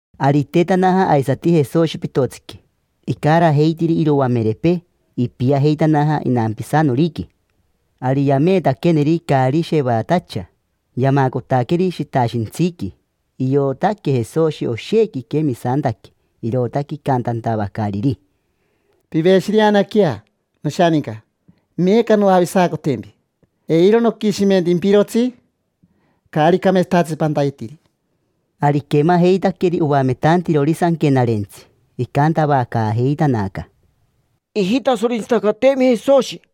Ari itetanaja aisati Jesoshi pitotsiqui, icarajeitiri iroamerepee. Ipiajeitanaja inampisanoriqui. Ari yameetaqueneri caari shevatacha, yamacotaqueri shitashintsiqui. Iotaque Jesoshi oshequi iquemisantaque, irootaque icantantavacariri: —Piveshireanaquea, noshaninca, meeca noavisacotempi; eiro noquishimentimpirotsi caari cameetsatatsi pantayetiri. Ari iquemajeitaqueri oametantirori Sanquenarentsi, icantavacaajeitanaca: —Ijitasorentsitacateemi Jesoshi.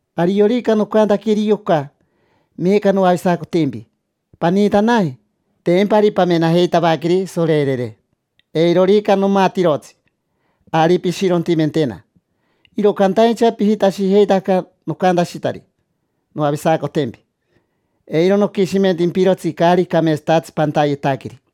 Ariorica noncantaqueri yoca: “Meeca noavisacotempi, paniitanaje”, tempa ari pamenajeitavaqueri, sorerere. Eirorica nomatirotsi, ari pishirontimentena. Iro cantaincha pijitashijeitaca nocantashitari: “Noavisacotempi, eiro noquishimentimpirotsi caari cameetsatatsi pantayetaqueri”.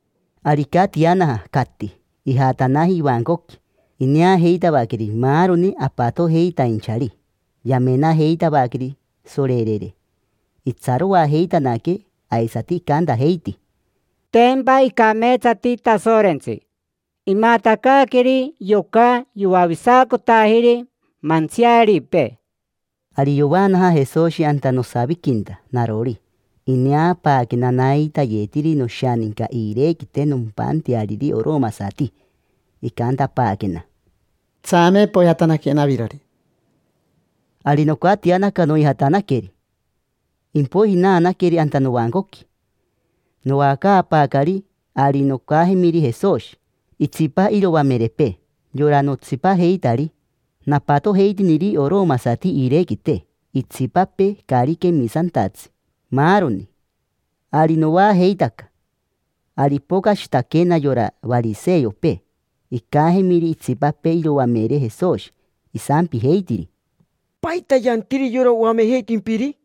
Ari icatianaja, cati; ijatanaji ivancoqui. Ineajeitavaqueri maaroni apatojeitainchari, yamenajeitavaqueri sorerere. Itsaroajeitanaque, aisati icantajeiti: —Tempa icameetsati Tasorentsi, imatacaaqueri yoca yoavisacotajiri mantsiaripee. Ari yovaanaja Jesoshi anta nosaviquinta narori. Ineapaaquena naitayetiri noshaninca iirequite nompanteariri oromasati. Icantapaaquena: —Tsame, poijatanaquena avirori. Ari nocatianaca, noijatanaqueri. Impoiji naanaqueri anta novancoqui, noacaapaacari. Ari nocajemiri Jesoshi, itsipa iroamerepee, yora notsipajeitari napatojeitiniri oromasati iirequite, itsipapee caari quemisantatsi, maaroni. Ari noajeitaca. Ari ipocashitaquena yora variseopee, icajemiri itsipapee iroamere Jesoshi, isampijeitiri: —¿Paita yantiri yora oamejeitimpiri?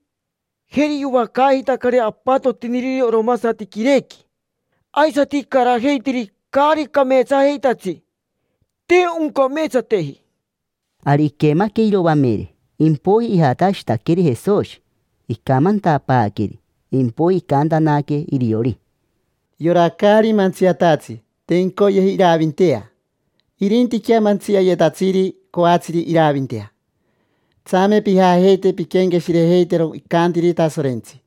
Jeri yoacaajeitacari apatotiniriri oromasati quirequi, aisati icarajeitiri caari cameetsajeitatsi. Te oncameetsateji. Ari iquemaque iroamere, impoiji ijatashitaqueri Jesoshi, icamantapaaqueri; impoiji icantanaque iriori: —Yora caari mantsiatatsi te incoyeji iravintea, irintiquea mantsiayetatsiri coatsiri iravintea. Tsame pijajeite pinquenqueshirejeitero icantiri Tasorentsi: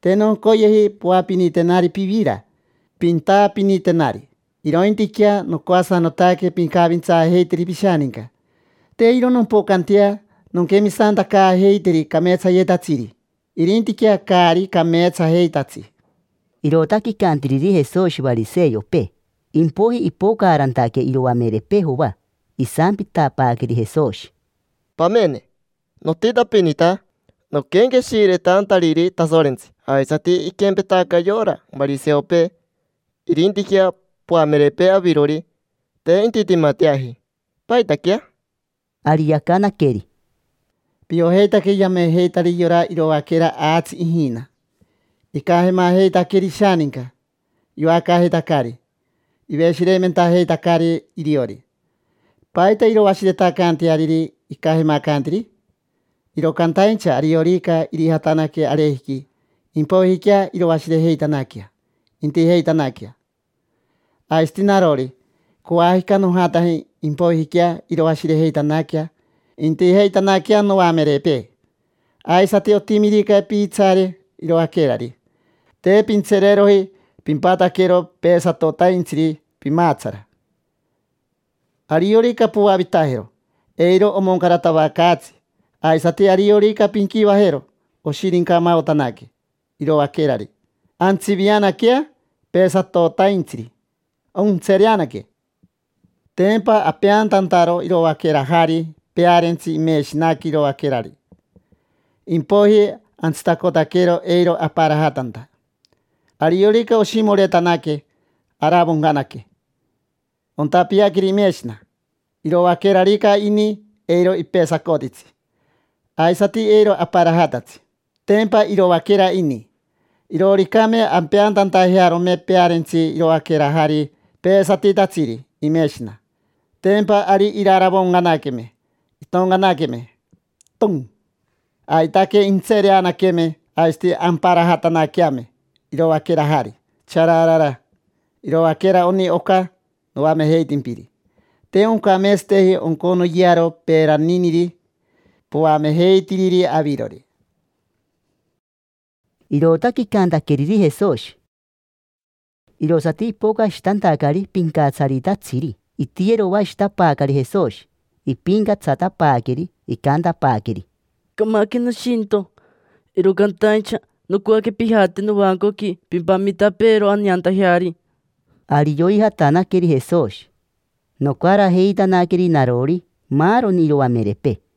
“Te noncoyeji poapinitenari pivira, pintaapinitenari; irointiquea nocoasanotaque pincavintsaajeiteri pishaninca”. Te iro nompocantea nonquemisantacaajeiteri cameetsayetatsiri, irintiquea caari cameetsajeitatsi. Irootaque icantiriri Jesoshi variseopee. Impoiji ipocaarantaque iroamerepee Joa, isampitapaaqueri Jesoshi: —Pamene, notitapinita noquenqueshiretantariri Tasorentsi, aisati iquempetaca yora variseopee; irintiquea poamerepee avirori, te intitimateaji. ¿Paitaquea? Ari yacanaqueri: —Piojeitaque yamejeitari yora iroaquera aatsi ijina: icajemajeitaqueri ishaninca, yoacaajeitacari, iveshireimentajeitacari iriori. ¿Paita iroashiretacanteariri icajemacantiri? Iro cantaincha, ariorica irijatanaque arejiqui, impoijiquea iroashirejeitanaquea, intijeitanaquea. Aisati narori, coajica nojataje, impoijiquea iroashirejeitanaquea, intijeitanaquea noamerepee. Aisati, otimirica piitsaare iroaquerari, te pintsereeroji pimpataquero peesatotaintsiri pimaatsara. Ariorica poavitajero, eiro omoncaratavacaatsi. Aisati ariorica pinquivajero oshirincamaotanaque iroaquerari, antsivianaquea peesatotaintsiri, ontsereanaque. Tempa apeantantaro iroaquerajari pearentsi imeshinaqui iroaquerari, impoiji antsitacotaquero eiro aparajatanta. Ariorica oshimoretanaque, aravoncanaque, ontapiaqueri imeshina. Iroaquerarica ini, eiro ipesacotitsi, aisati eiro aparajatatsi: tempa iroaquera ini. Irooricame ampeantantajearome pearentsi iroaquerajari peesatitatsiri imeshina, tempa ari iraravoncanaqueme, intoncanaqueme, ton. Aitaque intsereanaqueme, aisati amparajatanaqueame iroaquerajari, chararara. Iroaquera oni oca noamejeitimpiri, te oncameetsateji onconoyearo peeraniniri poamejeitiriri avirori. Irootaque icantaqueriri Jesoshi. Irosati ipocashitantacari pincatsaritatsiri, itiyeroashitapaacari Jesoshi, ipincatsatapaaqueri; icantapaaqueri: —Camaque nishintio, iro cantaincha nocoaque pijate novancoqui pimpamitapeero aneantajeari. Ari yoijatanaqueri Jesoshi, nocarajeitanaqueri narori, maaroni iroamerepee.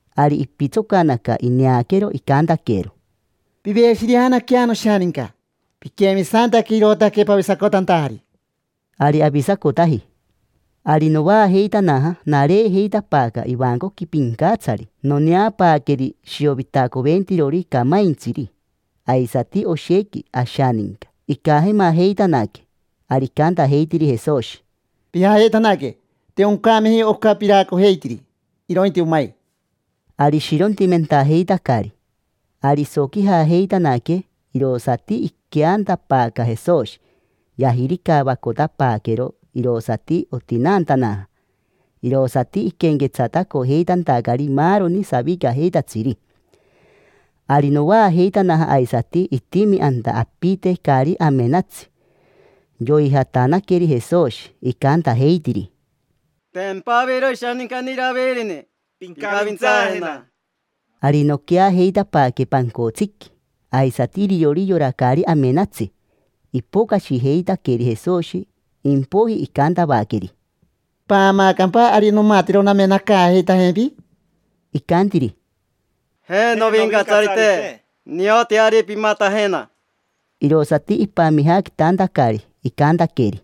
Ari ipitsocanaca, ineaquero, icantaquero: —Piveshireanaquea, noshaninca, piquemisantaque, irootaque pavisacotantajari. Ari avisacotaji. Ari novaajeitanaja, nareejeitapaaca ivancoqui pincatsari, noneapaaqueri shiovitacoventirori camaintsiri, aisati oshequi ashaninca, icajemajeitanaque. Ari icantajeitiri Jesoshi: —Pijajeitanaque. Te oncameji oca piraacojeitiri, irointi omai. Ari ishirontimentajeitacari, iji, iji, iji. Ari isoquijajeitanaque, irosati iqueantapaaca Jesoshi. Yajiricavacotapaaquero, irosati otinaantanaja. Irosati iquenquetsatacojeitantacari maaroni savicajeitatsiri. Ari novaajeitanaja aisati, itimi anta apite caari amenatsi. Yoijatanaqueri Jesoshi, icantajeitiri: —Tempa aviro ishanincani Iravirini. Pincavintsaajena. Ari noqueajeitapaaque pancotsiqui, aisati iriori yora caari amenatsi. Ipocashijeitaqueri Jesoshi, impoiji icantavaqueri: —¿Paamaacampa ari nomatero namenacaajeitajempi? Icantiri: —Je, novincatsarite; nioti ari pimatajena. Irosati ipamijaquitantacari, icantaqueri: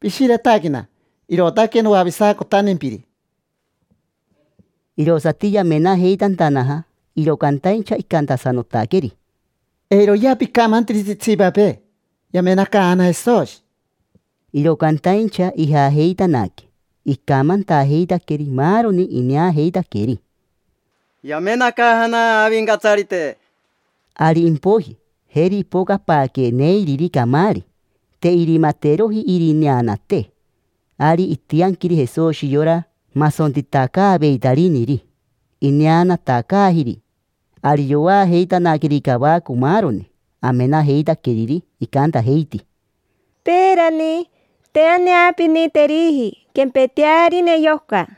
—Pishiretaquena, irootaque noavisacotantempiri. Irosati yamenajeitantanaja, iro cantaincha icantasanotaqueri: —Eiroyea picamantiritsi itsipapee: “Yamenacaajana Jesoshi”. Iro cantaincha ijajeitanaque, icamantajeitaqueri maaroni ineajeitaqueri: —Yamenacaajana Avincatsarite. Ari impoiji, jeri ipocapaaque neiriri camaari, te irimateroji irineanate. Ari itianquiri Jesoshi yora masontitacaaveitariniri, ineanatacaajiri. Ari yoajeitanaqueri cavaco maaroni amenajeitaqueriri, icantajeiti: —Peerani, te aneapiniteriji quempetearine yoca.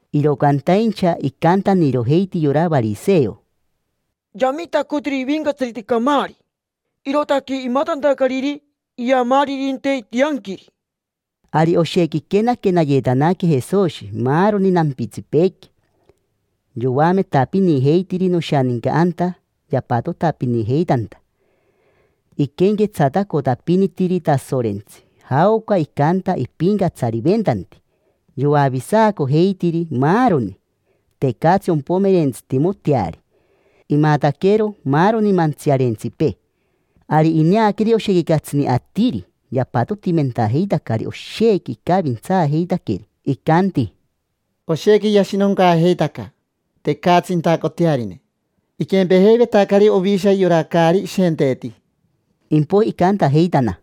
Iro cantaincha icantanirojeiti yora variseo: —Yamitacotiri ivincatsarite camaari, irootaque imatantacariri iamaaririnte itianquiri. Ari oshequi iquenaquenayetanaque Jesoshi maaroni nampitsipeequi, yoametapinijeitiri noshaninca anta yapatotapinijeitanta. Iquenquetsatacotapinitiri Tasorentsi, jaoca icanta ipincatsariventanti. Yoavisacojeitiri maaroni: tecatsi ompomerentsitimoteari, imataquero maaroni mantsiarentsipee. Ari ineaqueri oshequi catsini atiri yapatotimentajeitacari, oshequi icavintsaajeitaqueri. Icanti: —Oshequi yashinoncaajeitaca, tecatsi intacotearine. Iquempejeivetacari ovisha yora caari ishenteeti. Impoiji icantajeitana: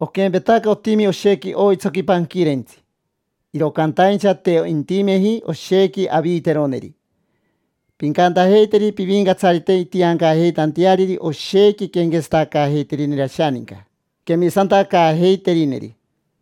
—Oquempetaca otimi oshequi oitsoqui panquirentsi, iro cantaincha te intimeji oshequi aviiteroneri. Pincantajeiteri Pivincatsarite intiancajeitanteariri oshequi quenquetsatacaajeiterineri ashaninca, quemisantacaajeiterineri.